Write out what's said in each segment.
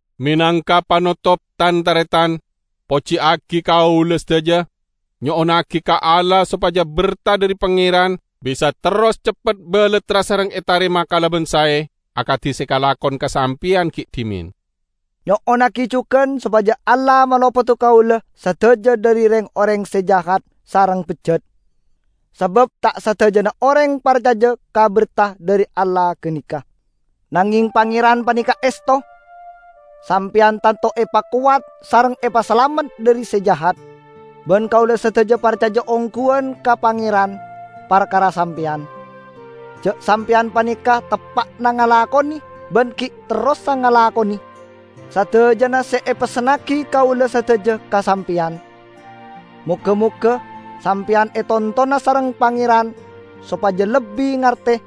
Menangka panotop, tan-taretan, pojiyagi kaula sadaja; nyo'onnagi ka Allah sopaja berta dhari Pangeran bisa terros ceppet balattra sareng etarema kalaban sae, akadi se kalakon ka sampeyan gi' dhimen. Nyo'onnagi jugan sopaja Allah malopoda kaula sadaja dhari reng-oreng se jahat sareng bejjat. Sabab ta' sadajana oreng parcaja ka berta dhari Allah ganeka. Nangeng Pangeran paneka esto. Sampeyan tanto epakowat sareng epasalamet dhari Se Jahat. Ban kaula sadaja parcaja ongguwan ka Pangeran parkara sampeyan, ja' sampeyan paneka teppa'na ngalakone ban gi' terrosa ngalakone sadajana se epessennagi kaula sadaja ka sampeyan. Moga-moga sampeyan etontona sareng Pangeran sopaja lebbi ngarte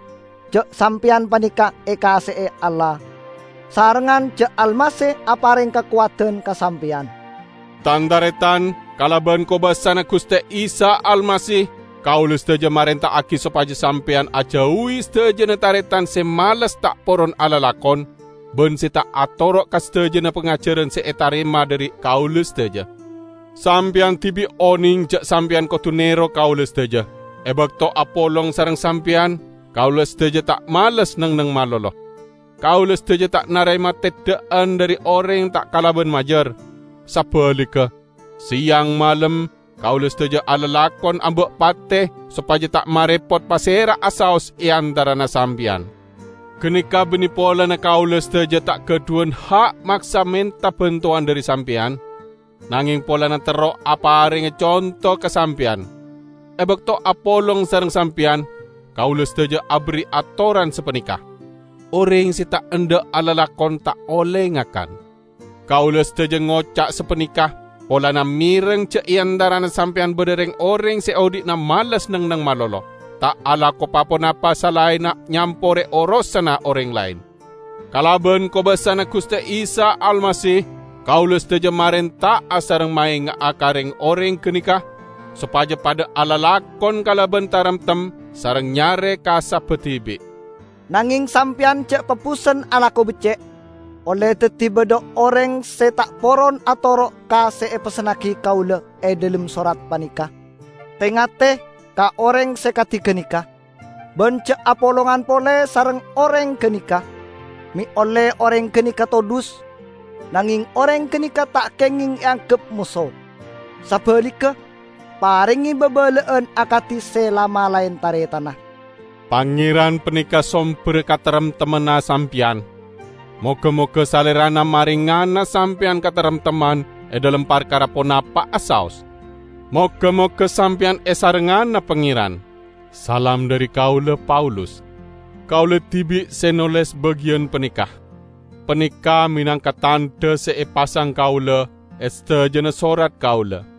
ja' sampeyan paneka ekaase'e Allah, sarengngan ja' Almasih apareng kakowadan ka sampeyan. Tan-taretan, kalaban kobasana Guste Isa Almasih, kaula sadaja marenta'agi sopaja sampeyan ajauwi sadajana taretan se males ta' poron alalakon, ban se ta' atoro' ka sadajana pangajaran se etarema dhari kaula sadaja. Sampeyan dibi' oneng ja' sampeyan kodu nero kaula sadaja. E bakto apolong sareng sampeyan, kaula sadaja ta' males neng-enneng malolo. Kaula sadaja ta' narema teddha'an dhari oreng ta' kalaban majar. Sabaligga, seyang malem kaula sadaja alalakon amba' pate sopaja ta' marepot pasera'a saos e antarana sampeyan. Ganeka banne polana kaula sadaja ta' gadhuwan ha' maksa menta bantowan dhari sampeyan, nangeng polana terro aparenga conto ka sampeyan. E bakto apolong sareng sampeyan, kaula sadaja aberri' atoran sapaneka, "Oreng se ta' endha' alalakon ta' olle ngakan." Kaula sadaja ngoca' sapaneka polana mereng ja' e antarana sampeyan badha reng-oreng se odhi'na males neng-enneng malolo, ta' alako pa-ponapa salaenna nyampore orosanna oreng laen. Kalaban kobasana Guste Isa Almasih kaula sadaja marenta'a sareng maenga'a ka reng-oreng ganeka sopaja padha alalakon kalaban taremtem sareng nyare kasabba dibi'. Nangeng sampeyan ja' pabusen alako becce'. Olle daddi badha oreng se ta' poron atoro' ka se epessennagi kaula e dhalem sorat paneka. Te-ngate ka oreng se kadi ganeka, ban ja' apolongan pole sareng oreng ganeka, me' olle oreng ganeka todhus. Nangeng oreng ganeka ta' kengeng eanggep moso. Sabaligga, parenge babala'an akadi se la-malae taretanna. Pangeran paneka somberra kataremtemmanna sampeyan. Moga-moga Salerana marengana sampeyan kataremtemman e dhalem parkara ponapa'a saos. Moga-moga sampeyan esarengngana Pangeran. Salam dhari kaula, Paulus. Kaula dibi' se noles bagiyan paneka. Paneka menangka tandha se epasang kaula e sadajana sorat kaula.